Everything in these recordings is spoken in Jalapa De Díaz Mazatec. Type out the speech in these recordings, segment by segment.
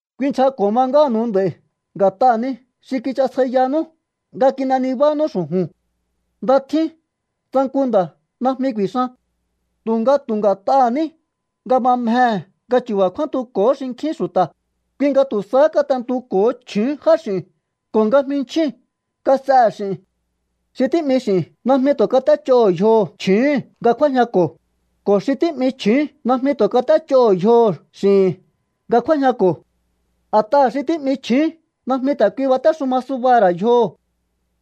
Kuinchjako̱ ma ngánu̱u nd'a̱i̱ nga̱t'aha̱ ni xi kichasjaiyanú nga kin'e nibánú xu̱ju̱n. Nda tjín tsa nku nda̱ najmi ku̱i̱xan. Tu̱nga tu̱ nga̱t'aha̱ ní nga ma mjehe̱ nga chu̱ba̱ kjúántuko̱hó xinkjín xu̱ta̱, kui nga tu̱ sahá kat'entuko̱ho chju̱ún jáx'i̱u̱n ko̱ nga jminchjíu̱n kas'ehe̱ x'i̱n. Xi tí'mi x'i̱n najmi tu̱ kat'échoho̱ yjoho̱ chju̱úhu̱n nga kjúájñako̱, ko̱ xi tí'mi chju̱ún najmi tu̱ kat'échoho̱ yjoho̱ x'i̱hi̱n nga kjúájñako̱. A̱t'aha̱ xi tí'mi chju̱ún najmi ta̱ kui batéxuma subaha̱ ra̱ yjoho̱.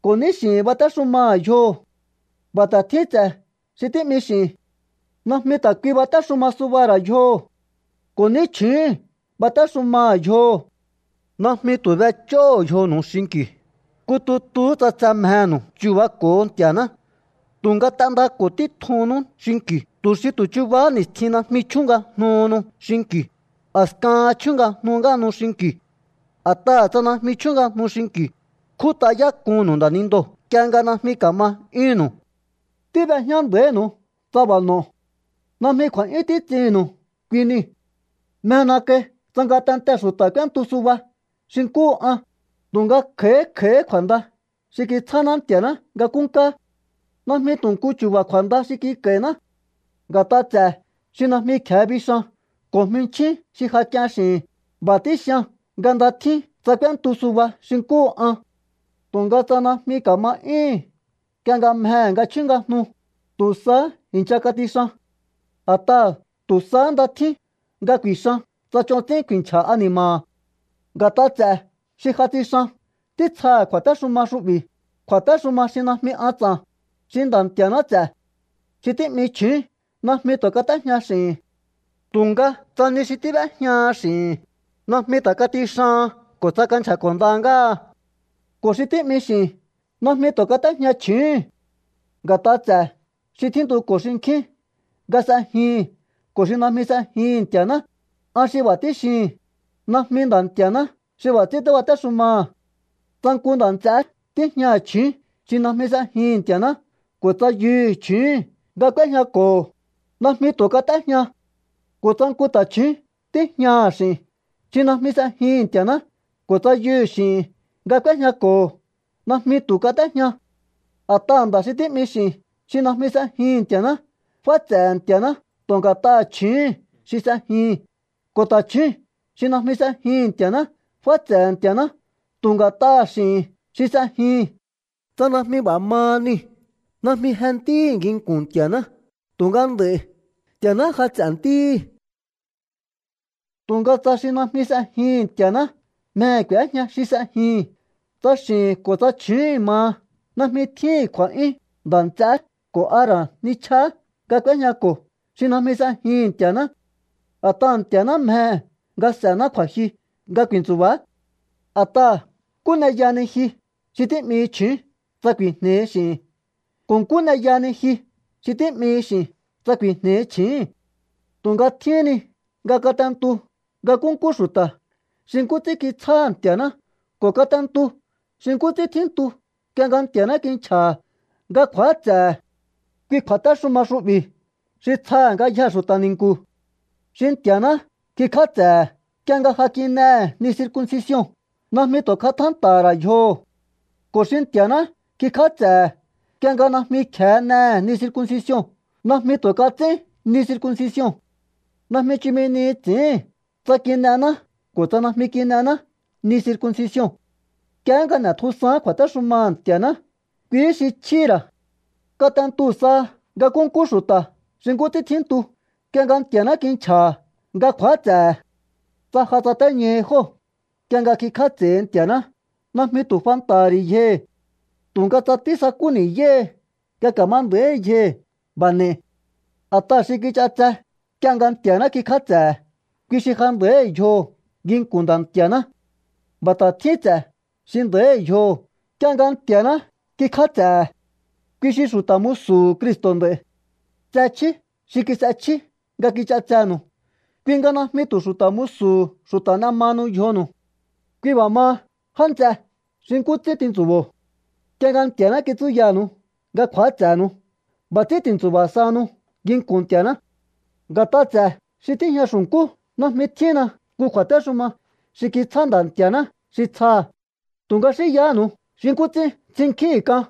Ko̱ ní x'i̱hi̱n batéxumaha̱ yjoho̱. B'a̱ ta̱ tjín ts'e̱ xi tí'mi x'i̱n. Najmi ta̱ kui batéxuma subaha̱ ra̱ yjoho̱. Ko̱ ní chju̱úhu̱n batéxumaha̱ yjoho̱. Najmi tu̱ b'ech'óho̱o yjonu̱u xinki̱u, nku tutuhú tsa tse mjenu̱u chu̱bako̱o Nti̱a̱ná. Tu̱nga t'endako̱ títjunnú xinki̱u tu̱ xi tu̱ chubahá ni̱stjin najmi chjúngajnuhunu xinki̱u, a̱skahan chjúngajnu ngáhanu xinki̱u. A̱t'aha̱ tsa najmi chjúngajnu xinki̱u, kjút'ayák'unnu̱u nda̱nindoo̱ nk'ie nga najmi ka̱ma 'yúhu̱nnu̱u. Tíb'ejñá nda̱ínu̱u tsa b'a̱ n'o̱o. Najmi kju̱a̱'yún títs'ihi̱nnu̱u kui nii̱. Mjena kai tsa ngatentee̱ xu̱ta̱ k'úéntu suba xi nkúhu an, tu̱nga kj'a̱í kj'a̱íhí kju̱a̱nda xi kitsjáná Nti̱a̱ná nga nkúnkáá. Najmi tu̱ nku chu̱ba̱ kju̱a̱nda xi kik'a̱i̱ná. Nga̱t'a ts'e̱ xi najmi kje̱e bixan ko̱ jminchín xi ja k'ien x'i̱hi̱n, b'a̱ tíxian nga nda tjín tsa k'úéntu suba xi nkúhu an. Tu̱nga tsa najmi ka̱ma 'yúhu̱n nk'ie nga mjehe̱ nga chjúngajnu, tu̱ sahá i̱ncha katixan. A̱t'aha̱ tu̱ sahá nda tjín nga ku̱i̱xan tsa ch'on ts'ín ku̱i̱nchja̱ ani̱ma̱ha̱. Nga̱t'a ts'e̱ xi ja tsixan títsjaha̱ kju̱a̱téxuma xu'bi̱, kju̱a̱téxuma xi najmi an ts'a̱n, xi Nda̱ Nti̱a̱ná ts'e̱. Xi tí'mi chju̱ún najmi tu̱ kat'éjña x'i̱hi̱n. Tu̱nga tsa ni xi tíb'éjñaha x'i̱hi̱n, najmi ta̱ katixahan ko̱ tsa kanchja̱ko̱nda ngáha. Ko̱ xi tí'mi x'i̱n najmi tu̱ kat'éjña chju̱úhu̱n. Nga̱t'a ts'e̱ xi tjíntuko̱ xinkjín nga s'ejihi̱n ko̱ xi najmi s'ejihi̱n Nti̱a̱ná, an xi b'a̱ tíxihi̱n, najmi Nda̱ Nti̱a̱ná xi b'a̱ ts'ín tíbatéxumaha̱. Tsa nku nda̱ nts'eé tíjñaha̱ chju̱ún xi najmi s'ejihi̱n Nti̱a̱ná ko̱ tsa yuhu̱ chju̱úhu̱n nga k'úéjñako̱ho̱, najmi tu̱ kat'éjña. Ko̱ tsa nku ta̱chju̱ún tíjñaha̱ x'i̱n xi najmi s'ejihi̱n Nti̱a̱ná ko̱ tsa yuhu̱ x'i̱hi̱n nga k'úéjñako̱ho̱, najmi tu̱ kat'éjña. A̱t'aha̱ nda̱ xi tí'mi x'i̱n xi najmi s'ejihi̱n Nti̱a̱ná, fáts'e̱he̱ Nti̱a̱ná tu̱ nga̱t'aha̱ chju̱úhu̱n xi s'ejihi̱n. Ko̱ ta̱chju̱ún xi najmi s'ejihi̱n Nti̱a̱ná, fáts'e̱he̱ Nti̱a̱ná tu̱ nga̱t'aha̱ x'i̱hi̱n xi s'ejihi̱n. Tsa najmi b'a̱ maha niu̱, najmi je ntíhi̱ nginku̱n Nti̱a̱ná. Tu̱nga nd'a̱i̱ Nti̱a̱ná ja ts'e̱ ntíhi̱. Tu̱nga tsa xi najmi s'ejihi̱n Nti̱a̱ná mjehe̱ k'u̱éjña xi s'ejihi̱n, tsa x'i̱hi̱n ko̱ tsa chju̱úhu̱n maha, najmi tjíhi̱n kju̱a̱'yún nda̱ nts'eé ko̱ a ra̱ nichjaá nga k'úéjñako̱ xi najmi s'ejihi̱n Nti̱a̱ná. A̱t'aha̱ Nti̱a̱ná mjehe̱ nga s'e̱ná kju̱a̱jyu nga ku̱i̱ntsu̱ba̱á. A̱t'aha̱, ¿nkú n'e yahani ji xi tí'mihi chju̱ún tsa ku̱i̱jne̱i̱hi x'i̱hi̱n? ¿Ko̱ nkú n'e yahani ji xi tí'mihi x'i̱n tsa ku̱i̱jne̱i̱hi chji̱íhi̱n? Tu̱nga tjíhín ni nga kat'entu nga nkúnkú xu̱ta̱ xi nkú ts'ín kitsjáha̱ Nti̱a̱ná ko̱ kat'entu xi nkú ts'ín tjíntu nk'ie nga Nti̱a̱ná kinchja̱ha̱ nga kju̱áts'e̱he̱. Kui kju̱a̱téxuma xu'bi̱ xi tsjaha̱ ngayjee̱ xu̱ta̱ ni̱nku̱. Xi Nti̱a̱ná kikj'áts'e̱he̱ nk'ie nga ja kin'ehe̱ ni circuncision, najmi tu̱ katjánta̱ha̱ ra̱ yjoho̱. Ko̱ xi Nti̱a̱ná kikj'áts'e̱he̱ nk'ie nga najmi kje̱e n'ehe̱ ni circuncision, najmi tu̱ kats'ín ni circuncision. Najmi chumi ni ts'i̱íhi̱n tsa kin'ená ko̱ tsa najmi kin'ená ni circuncision. Nk'iehé nga n'e̱tjusaán kju̱a̱téxumaha̱ Nti̱a̱ná, kuihí xi chjíhi̱ ra̱. Kat'entu saha nga nkúnkú xu̱ta̱ xi nkú ts'ín tjíntu nk'ie nga Nti̱a̱ná kinchja̱ha̱ nga kju̱áts'e̱he̱. Tsa ja tsatéñahi jóo̱ nk'ie nga kikj'áts'e̱hi Nti̱a̱ná, najmi tu̱ fanta̱ha̱ ri̱ yjohi̱. Tu̱nga tsa tísakú ni̱yáhi nga ka̱ma nda̱íhi yjohi̱, b'a̱ n'e̱i̱. A̱t'aha̱ xi kich'ats'e nk'ie nga Nti̱a̱ná kikj'áts'e̱he̱, kui xi ja nda̱íhi̱ yjoho̱ nginku̱n Nda̱ Nti̱a̱ná. B'a̱ ta̱ tjín ts'e̱ xi nda̱íhi̱ yjoho̱ nk'ie nga Nti̱a̱ná kikj'áts'e̱he̱. Kui xi xu̱ta̱ musu̱hu̱ Cristo̱ nd'a̱i̱. Tse chjí xi kis'echjí nga kich'atsenu̱u, kui nga najmi tu̱ xu̱ta̱ musu̱hu̱ xu̱ta̱ n'e mahanu yjonu̱u. Kui b'a̱ maha, já nts'e, xi nkú ts'ín tintsu̱bo̱o nk'ie nga Nti̱a̱ná kitsúyanu̱u nga kju̱áts'e̱nu̱u, b'a̱ ts'ín ti̱ntsu̱ba̱ sahanu nginku̱n Nti̱a̱ná. Nga̱t'a ts'e̱ xi tíjña xu̱nkú najmi tjínna nku kju̱a̱téxuma xi kitsjá Nda̱ Nti̱a̱ná xi tsjaha̱. Tu̱nga xínyahánu̱u xi nkú ts'ín ts'innkjíhi̱n k'an.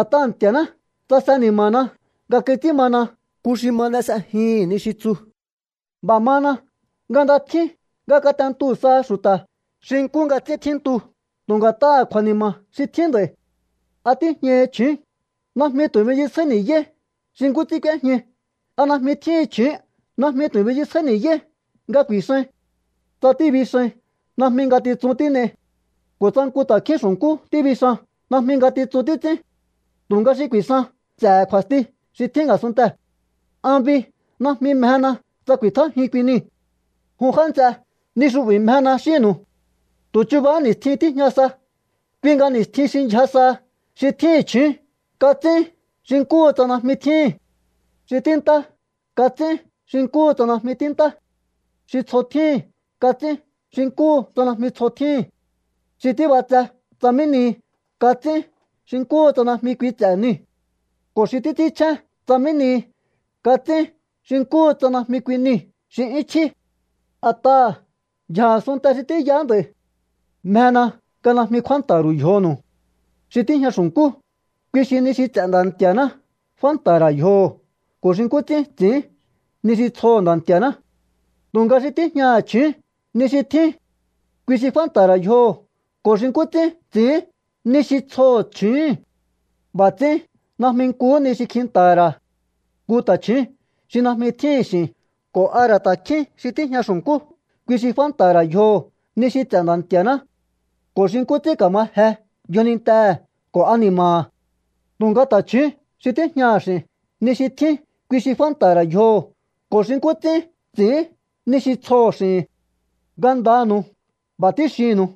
A̱t'aha̱ Nti̱a̱ná tsase ni̱ma̱na nga kits'ín mana nku xi ma n'e s'ejihi̱n ni xi tsu. B'a̱ mana nga nda tjín nga kat'entu saha xu̱ta̱ xi nkú nga ts'ín tjíntu tu̱ nga̱t'aha̱ kju̱a̱ni̱ma̱ xi tjín nd'a̱i̱. ¿A tíjñahi chju̱ún? Najmi tu̱ binchisjáí ni̱yáí xi nkú ts'ín k'úéjñai. ¿A najmi tjíhin chju̱ún? Najmi tu̱ binchisjáí ni̱yáí nga ku̱i̱xain. Tsa tíbixain, najmi ngatitsun tín'ei. Ko̱ tsa nku ta̱kjín xu̱nkú tíbixan, najmi ngatitsun títs'ín. Tu̱nga xi ku̱i̱xan s'e̱he̱ kju̱a̱sti xi tjín a̱sunntee̱. An bi, najmi mjena tsa ku̱i̱tjájiun kui niu̱. Jun já nts'e, ni xu'bi̱ xi mjena xínnu̱u. Tu̱ chubahá ni̱stjin tíjña sa. Kui nga ni̱stjin xi ndyja saha, xi tjíhi̱n chju̱ún kats'ín xi nkúhu tsa najmi tjíhi̱n. Xi tíintá kats'ín xi nkúhu tsa najmi tíintá. Xi tsjo tjíhi̱n kats'ín xi nkúhu tsa najmi tsjo tjíhi̱n. Xi tíb'atse tsa mí nihi, kats'ín xi nkúhu tsa najmi kui ts'e̱ niu̱. Ko̱ xi títs'ínchjén tsa mí nihi, kats'ín xi nkúhu tsa najmi kui niu̱ xi 'yún chjí. A̱t'aha̱ ndyja̱ a̱sunnte xi tíyaá nd'a̱i̱. Mjena nga najmi kjúánta̱ha̱ ru̱u yjonu̱u. Xi tíjña xu̱nkú, kui xi ni xi ts'e̱ Nda̱ Nti̱a̱ná fánta̱ha̱ ra̱ yjoho̱ ko̱ xi nkú ts'ín ts'i̱ín ni xi tsjoho̱ Nda̱ Nti̱a̱ná. Tu̱nga xi tíjñaha̱ chju̱ún, ni xi tjín kui xi fánta̱ha̱ ra̱ yjoho̱ ko̱ xi nkú ts'ín ts'i̱ín ni xi tsjoho̱ chju̱úhu̱n. B'a̱ ts'ín najmi nkuhú ni xi kjinta̱ha̱ ra̱. Nku ta̱chju̱ún xi najmi tjíhi̱n x'i̱n ko̱ a ra̱ ta̱kjín xi tíjña xu̱nkú, kui xi fánta̱ha̱ ra̱ yjoho̱ ni xi ts'e̱ Nda̱ Nti̱a̱ná ko̱ xi nkú ts'ín ka̱ma je yjonintehe̱ ko̱ ani̱ma̱ha̱. Tu̱nga ta̱chju̱ún xi tíjñaha̱ x'i̱n, ni xi tjín kui xi fánta̱ha̱ ra̱ yjoho̱ ko̱ xi nkú ts'ín ts'i̱ín ni xi tsjoho̱ x'i̱hi̱n. Ngandanu̱u b'a̱ tíxihi̱nnu̱u.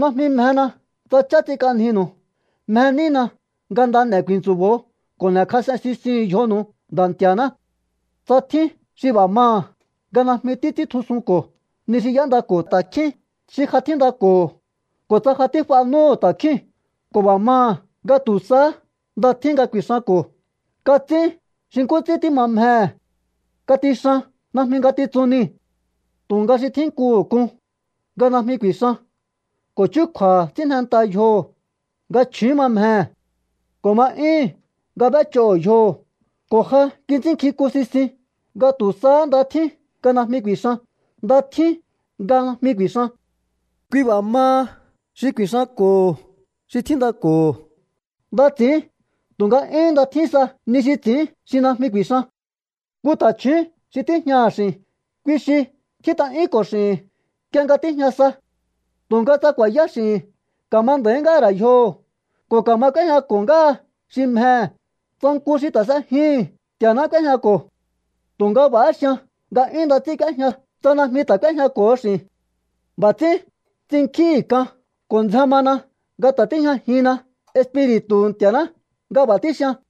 Najmi mjena tsa ch'á ts'ink'anjinu̱u. Mje nína nga nda n'e̱ ku̱i̱ntsu̱bo̱o ko̱ n'e̱kjas'en sisihu̱un yjonu̱u Nda̱ Nti̱a̱ná. Tsa tjín xi b'a̱ maha̱ nga najmi títs'íntjusunko̱ ni xi y'éndako̱ ta̱kjín xi ja tjíndako̱ho̱, ko̱ tsa ja tíf'a núhu̱ ta̱kjíu̱n ko̱ b'a̱ maha̱ nga tu̱ sahá nda tjín nga ku̱i̱xanko̱, kats'ín xi nkú ts'ín tíma mjehe̱. Katixan. Najmi ngatitsun niu̱. Tu̱nga xi tjínkuhu̱ k'un nga najmi ku̱i̱xan ko̱ chúkju̱a̱ha̱ ts'ín jnenta yjoho̱ nga chju̱ún ma mjehe̱, ko̱ ma 'yúhu̱n nga b'éch'oho̱ yjoho̱, ko̱ ja kits'ínnkjink'un sisin nga tu̱ sahá nda tjín nga najmi ku̱i̱xan, nda tjín nga najmi ku̱i̱xan. Kui b'a̱ maha, xi ku̱i̱xanko̱ho xi tjíndako̱ho̱, nda ts'i̱ín. Tu̱nga 'yún nda tjín sa ni xi ts'i̱ín xi najmi ku̱i̱xan. Nku ta̱chju̱ún xi tíjñaha̱ x'i̱n, kui xi tjít'a'yúnko̱ x'i̱hi̱n nk'ie nga tíjña sa. Tu̱nga tsa ku̱a̱yá x'i̱hi̱n, ka̱ma nda̱í ngáha̱ ra̱ yjoho̱ ko̱ ka̱ma k'úéjñako̱ ngáha xi mjehe̱, tsa nku xi ta̱ s'ejihi̱n Nti̱a̱ná k'úéjñako̱. Tu̱nga b'a̱há xian nga 'yún nda ts'ín k'úéjña tsa najmi ta̱ k'úéjñako̱ho x'i̱n. B'a̱ ts'ín ts'innkjíhi̱n k'an ko̱ ndzjen mana nga ta̱ tíjñajinna Espiri̱tu̱hu̱ Nti̱a̱ná nga b'a̱ tíxian.